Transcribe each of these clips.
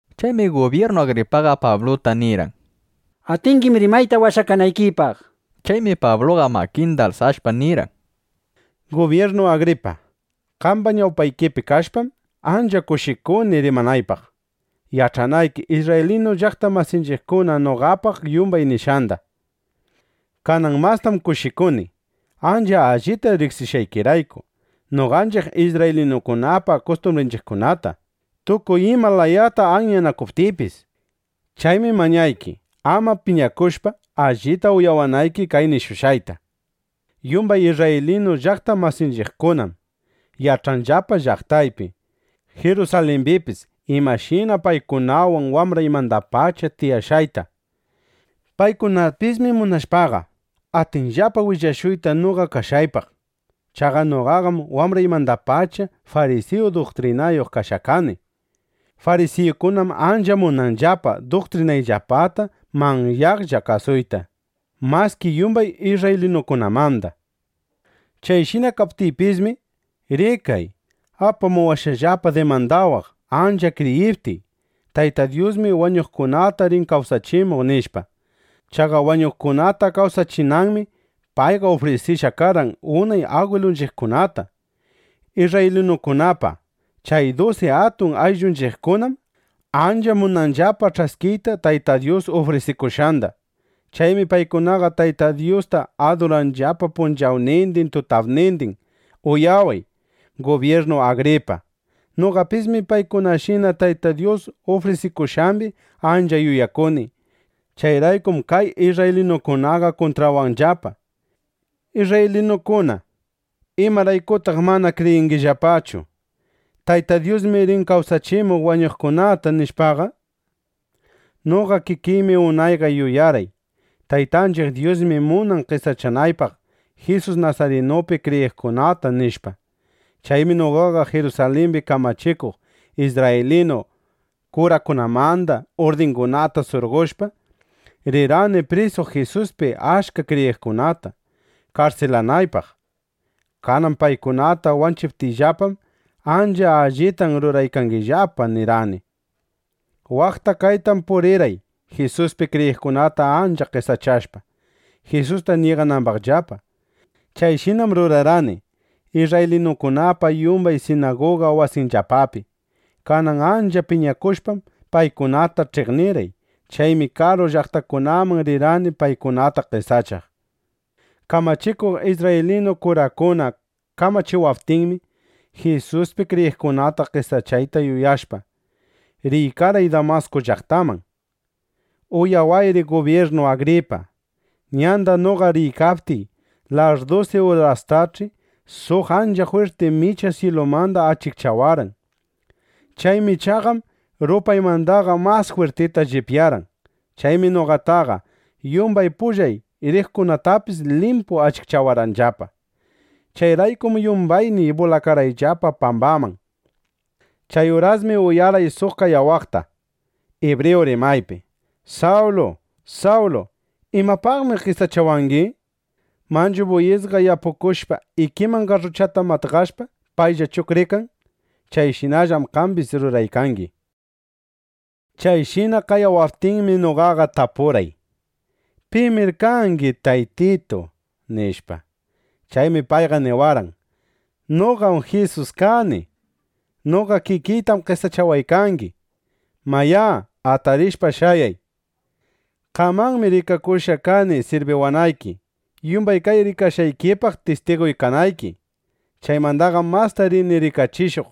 Chaymi gubyirnu Agripaqa Pabluta nirqan: —Atingim rimayta washakanaykipaq, nishpa. Chaymi Pabluqa makinda alsashpa, nirqan: —Gubyirnu Agripa, qamba ñawpaykipi kashpam, ancha kushikuni rimanaypaq, yach'anayki isrraylinu llaqta masinchiqkuna noqapaq yumbay nishqanda. Kanan mastam kushikuni ancha allita riqsishqaykirayku noqanchiq isrraylinukunapa kustumbrinchiqkunata, tukuy ima layata anyanakuptiypis. Chaymi mañayki, ama piñakushpa, allita uyawanayki kay nishushqayta. ’Yumbay isrraylinu llaqta masinchiqkunam yach'anllapa llaqtaypi, Jirusalimbipis imashina paykunawan wambraymandapacha tiyashqayta. Paykunapismi munashpaqa, atinllapa willashuyta noqa kashqaypaq. Chaqa noqaqam wambraymandapacha farisiyu duktrinayuq kashqa kani. Farisiyukunam ancha munanillapa duktrinayllapata manyaqlla kasuyta maski yumbay isrraylinukunamanda. Chayshina kaptiypismi, rikay, apamuwashqallapa dimandawaq, ancha kriyiptiy: Tayta Dyusmi wañuqkunata rin kawsachimuq, nishpa. Chaqa wañuqkunata kawsachinanmi payqa ufrisishqa karqan unay agwilunchiqkunata. Isrraylinukunapa chay dusi atun ayllunchiqkunam ancha munanllapa ch'askiyta Tayta Dyus ufrisikushqanda. Chaymi paykunaqa Tayta Dyusta aduranllapa punchawnindin tutapnindin. Uyaway, Gubyirnu Agripa. Noqapismi paykunashina Tayta Dyus ufrisikushqambi ancha yuyakuni. Chayraykum kay isrraylinukunaqa kuntrawanllapa. Isrraylinukuna, ¿imaraykutaq mana kriyingillapachu: Tayta Dyusmi rin kawsachimuq wañuqkunata, nishpaqa? ’Noqa kikiymi unayqa yuyarqay: Taytanchiq Dyusmi munan qesachanaypaq Jisus Nasarinupi kriyiqkunata, nishpa. Chaymi noqaqa Jirusalimbi kamachikuq isrraylinu kurakunamanda urdingunata surqoshpa, rirqani prisuq Jisuspi achka kriyiqkunata, karsilanaypaq. Kanan paykunata wanchiptinllapam: “Ancha allitam ruraykangillapa”, nirqani. Waqta kaytam purirqay Jisuspi kriyiqkunata ancha qesachashpa, Jisusta ñiganambaqllapa. Chayshinam rurarqani isrraylinukunapa yumbay sinaguga wasiyllapapi. Kanan ancha piñakushpam, paykunata ch'iqnirqay. Chaymi karu llaqtakunaman rirqani, paykunata qesachaq. ’Kamachikuq isrraylinu kurakuna kamachiwaptinmi, Jisuspi kriyiqkunata qesachayta yuyashpa, riykarqay Damasku llaqtaman. Uyawayri Gubyirnu Agripa, ñanda noqa riykaptiy, larrdusi urastach'i suq ancha jwirti micha syilumanda achikchawarqan. Chay michaqam rupaymandaqa mas jwirtita llipyarqan. Chaymi noqataqa, yumbay pullay riqkunatapis limpu achikchawarqanllapa. Chayraykum yumbayniy bulakarqayllapa pambaman. Chay urasmi uyarqay suq qayawaqta ibriyu rimaypi: “Sawlu, Sawlu, ¿imapaqmi qesachawangi? Manchu buyisqa yapukushpa, ikiman garruchata matqashpa, paylla chuqrikan. Chayshinallam qambis ruraykangi”, nishpa. Chayshina qayawaptinmi, noqaqa tapurqay: “¿Pimir kangi, Taytitu?” nishpa. Chaymi payqa niwarqan: “Noqam Jisus kani. Noqa kikiytam qesachawaykangi. Mayá, atarishpa shayay. Qamanmi rikakushqa kani sirbiwanayki, yumbay kay rikashqaykipaq tistiguy kanayki. Chaymandaqam masta rini rikachishuq,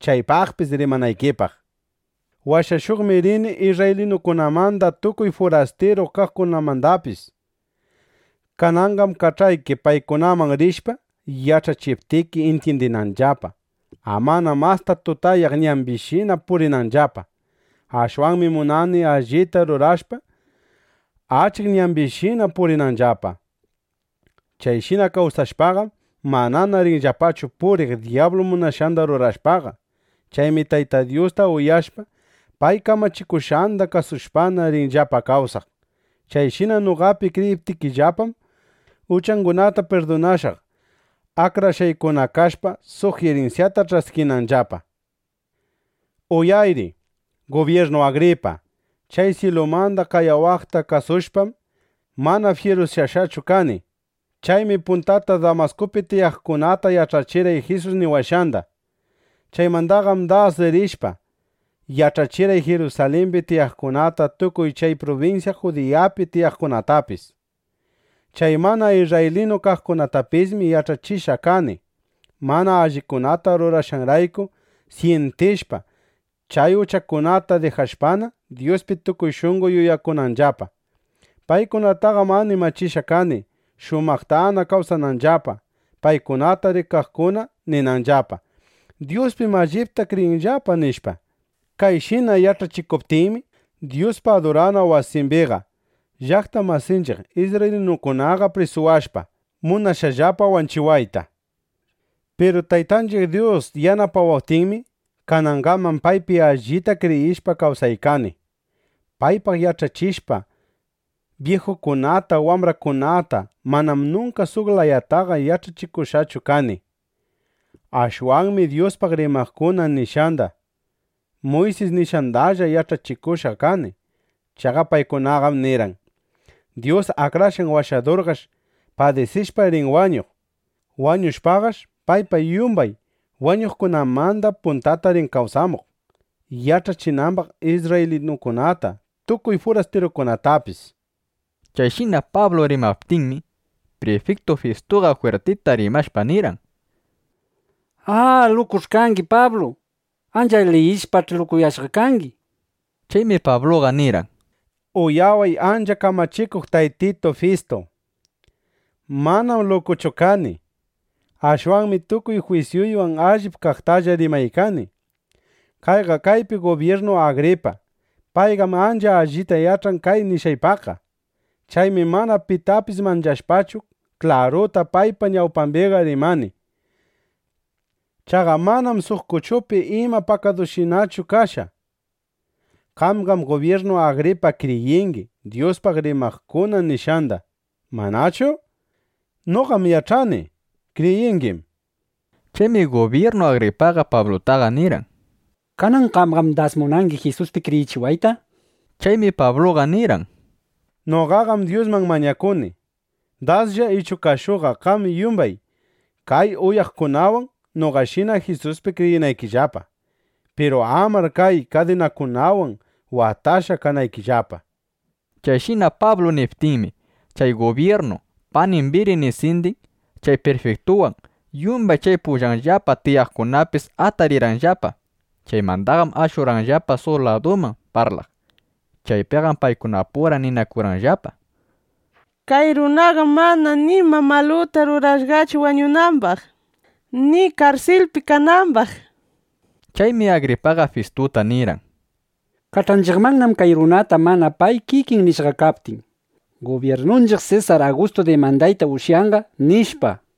chaypaqpis rimanaykipaq. Washashuqmi rini isrraylinukunamanda tukuy furastiru kaqkunamandapis. Kananqam kach'ayki, paykunaman rishpa, yach'achiptiki, intyindinanllapa, amana masta tutayaq ñambishina purinanllapa. Ashwanmi munani, allita rurashpa, achik ñambishinana purinanllapa. Chayshina kawsashpaqam, manana rinllapachu puriq dyablu munashqanda rurashpaqa. Chaymi Tayta Dyusta uyashpa, pay kamachikushqanda kasushpana, rinllapa kawsaq. Chayshina noqapi kriyiptinllapam, uchangunata pirdunashaq, akrashqaykuna kashpa, suq irinsyata ch'askinanllapa”, nishpa. ’Uyayri, Gubyirnu Agripa. Chay syilumanda qayawaqta kasushpam, mana fyirusyashqachu kani. Chaymi puntata Damaskupi tiyaqkunata yach'achirqay Jisus niwashqanda. Chaymandaqam das rishpa, yach'achirqay Jirusalimbi tiyaqkunata tukuy chay prubinsya Judiyapi tiyaqkunatapis. Chay mana isrraylinu kaqkunatapismi yach'achishqa kani, mana allikunata rurashqanrayku syintishpa, chay uchakunata dijashpana, Dyuspi tukuy shunqo yuyakunanllapa. Paykunataqam animachishqa kani, shumaqtana kawsananllapa, paykunata rikaqkuna ninanllapa: Dyuspim allipta kriyinllapa, nishpa. Kayshina yach'achikuptiymi, Dyuspa adurana wasimbiqa llaqta masinchiq isrraylinukunaqa prisuwashpa, munashqallapa wanchiwayta. Piru Taytanchiq Dyus yanapawaptinmi, kanangaman paypi allita kriyishpa kawsaykani, paypaq yach'achishpa byijukunata wambrakunata. Manam nunka suq layataqa yach'achikushqachu kani. Ashwanmi Dyuspaq rimaqkuna nishqanda, Muysis nishqandalla yach'achikushqa kani. Chaqa paykunaqam nirqan: “Dyus Akrashqan Washadurqash padisishpa rin wañuq. Wañushpaqash payqa yumbay wañuqkunamanda puntata rin kawsamuq, yach'achinambaq isrraylinukunata, tukuy furastirukunatapis”, nishpa. Chayshina Pablu rimaptinmi, prifiktu Fistuqa jwirtita rimashpa nirqan: —¡A, lukuch'i kangi, Pablu! ¡Ancha liyishpach'i, lukuyashqa kangi! nishpa. Chaymi Pabluqa nirqan: —Uyaway ancha kamachikuq Taytitu Fistu. Manam lukuchu kani. Ashwanmi tukuy jwisyuywan allip kaqtalla rimaykani. Kayqa kaypi Gubyirnu Agripa; payqam ancha allita yach'an kay nishqaypaqqa. Chaymi mana pitapis manchashpachu, klaruta paypa ñawpambiqa rimani. Chaqa manam suq kuchupi ima pakadushinachu kashqa. Qamqam Gubyirnu Agripa kriyingi Dyuspaq rimaqkuna nishqanda, ¿manachu? Noqam yach'ani kriyingim, nishpa. Chaymi Gubyirnu Agripaqa Pablutaqa nirqan: —Kanan qamqam das munangi Jisuspi kriyichiwayta, nishpa. Chaymi Pabluqa nirqan: —Noqaqam Dyusman mañakuni, daslla ichu qashuqa qam yumbay kay uyawaqkunawan noqashina Jisuspi kriyinaykillapa; piru amar kay kadinakunawan watashqa kanaykillapa. Chayshina Pablu niptinmi, chay gubyirnu, panin Birinisindin, chay prifiktuwan, yumbay chay pullanllapa tiyaykaqkunapis atarirqanllapa. Chaymandaqam ashurqanllapa suq laduman parlaq. Chaypiqam paykunapura ninakurqanllapa: —Kay runaqam mana nima maluta rurashqachu wañunambaq, ni karsilpi kanambaq. Chaymi Agripaqa Fistuta nirqan: —Kach'anchiqmannam kay runata, mana pay kikin nishqa kaptin: “Gubyirnunchiq Sesar Agustu dimandayta ushyanqa”, nishpa.